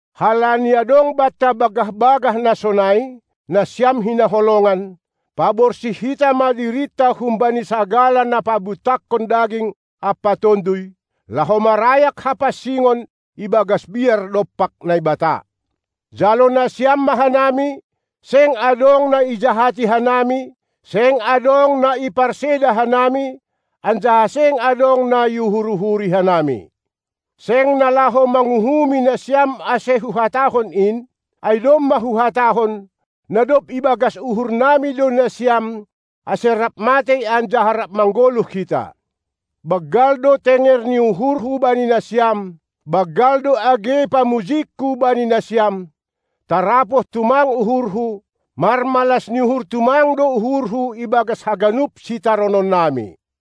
Halani adong banta bagah-bagah na sonai, nasiam hinaholongan, paborsih hita ma dirinta humbani sagala na pabutakkon daging ampa tonduy, laho marayak hapansingon ibagas biar dompak Naibata. Jalo nasiam ma hanami; seng adong na ijahati hanami, seng adong na iparseda hanami, anjaha seng adong na iuhur-uhuri hanami. Seng na laho manguhumi nasiam ase huhatahon in, ai domma huhatahon, na dob ibagas uhurnami do nasiam, ase rap matei anjaha rap manggoluh hita. Banggal do tenger ni uhurhu bani nasiam, banggal do age pamujingku bani nasiam; tarapoh tumang uhurhu, marmalas ni uhur tumang do uhurhu ibagas haganup sitarononnami.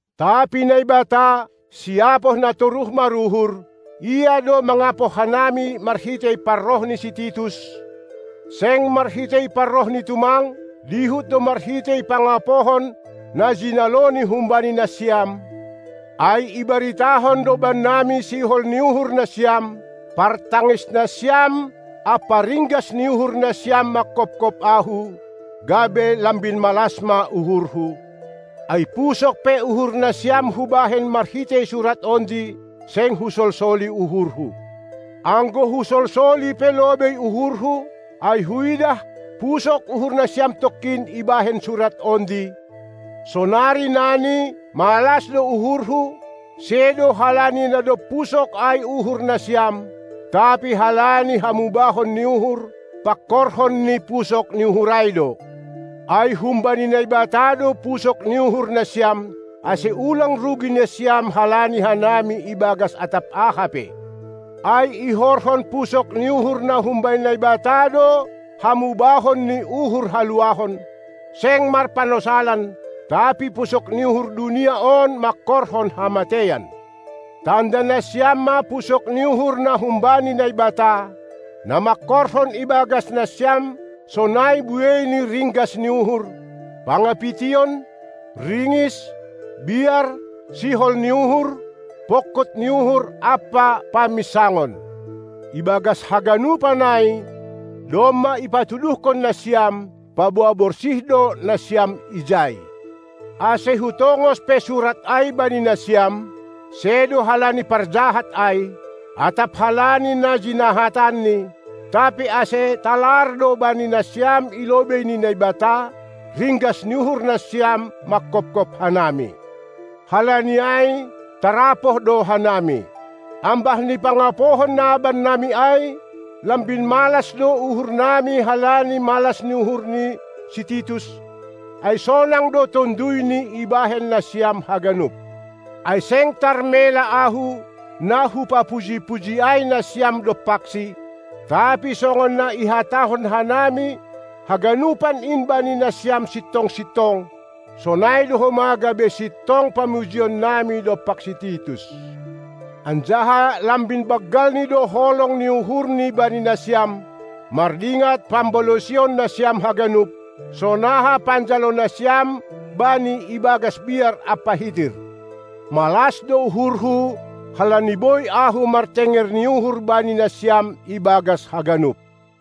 Tapi Naibata, siapoh na toruh maruhur. Ia do mangapoh hanami marhitei, parroh ni si Titus, seng marhitei parrohni tumang, dihut do marhitei pangapohon, na jinaloni humbani nasiam; ai ibaritahon do bannami sihol ni uhur nasiam, partangis nasiam, ampa ringgas ni uhur nasiam manghophop ahu, gabe lambin malas ma uhurhu. Ai pusok pe uhur nasiam hubahen marhitei surat ondi, seng husolsoli uhurhu. Anggo husolsoli pe lobei uhurhu, ai huidah pusok uhur nasiam tongkin ibahen surat ondi, sonari nani malas do uhurhu, sedo halani na dob pusok ai uhur nasiam, tapi halani hamubahon ni uhur, pangkorhon ni pusok uhur ai do. Ai humbani Naibata do pusok ni uhur nasiam, ase ulang rugi nasiam halani hanami ibagas atap aha pe. Ai ihorhon pusok ni uhur na humbani Naibata do hamubahon ni uhur huluahon, seng marpanosalan; tapi pusok ni uhur dunia on mangkorhon hamateian. Tanda nasiam ma pusok ni uhur na humbani Naibata, na mangkorhon ibagas nasiam sonai buei ni ringgas ni uhur, pangapition, ringis, biar, sihol ni uhur, pongkut ni uhur ampa paminsangon. Ibagas haganupan ai domma ipatuduhkon nasiam, paboa borsih do nasiam ijai. Ase hutongos pe surat ai bani nasiam; sedo halani parjahat ai, atap halani na jinahatanni, tapi ase talar do bani nasiam i lobei ni Naibata, ringgas ni uhur nasiam manghophop hanami. Halani ai tarapoh do hanami. Ambah ni pangapohon na bannami ai, lambin malas do uhurnami halani malas ni uhur ni si Titus, ai sonang do tonduyni ibahen nasiam haganup. Ai seng tarmela ahu, na hupapuji-puji ai nasiam dompaksi, tapi songon na ihatahon hanami haganupan in bani nasiam sintong-sintong, sonai do homa gabe sintong pamujinami dompak si Titus. Anjaha lambin banggalni do holong ni uhurni bani nasiam, mardingat pambalosion nasiam haganup, sonaha panjalo nasiam bani ibagas biar ampa hitir. Malas do uhurhu, halani boi ahu martenger ni uhur bani nasiam ibagas haganup.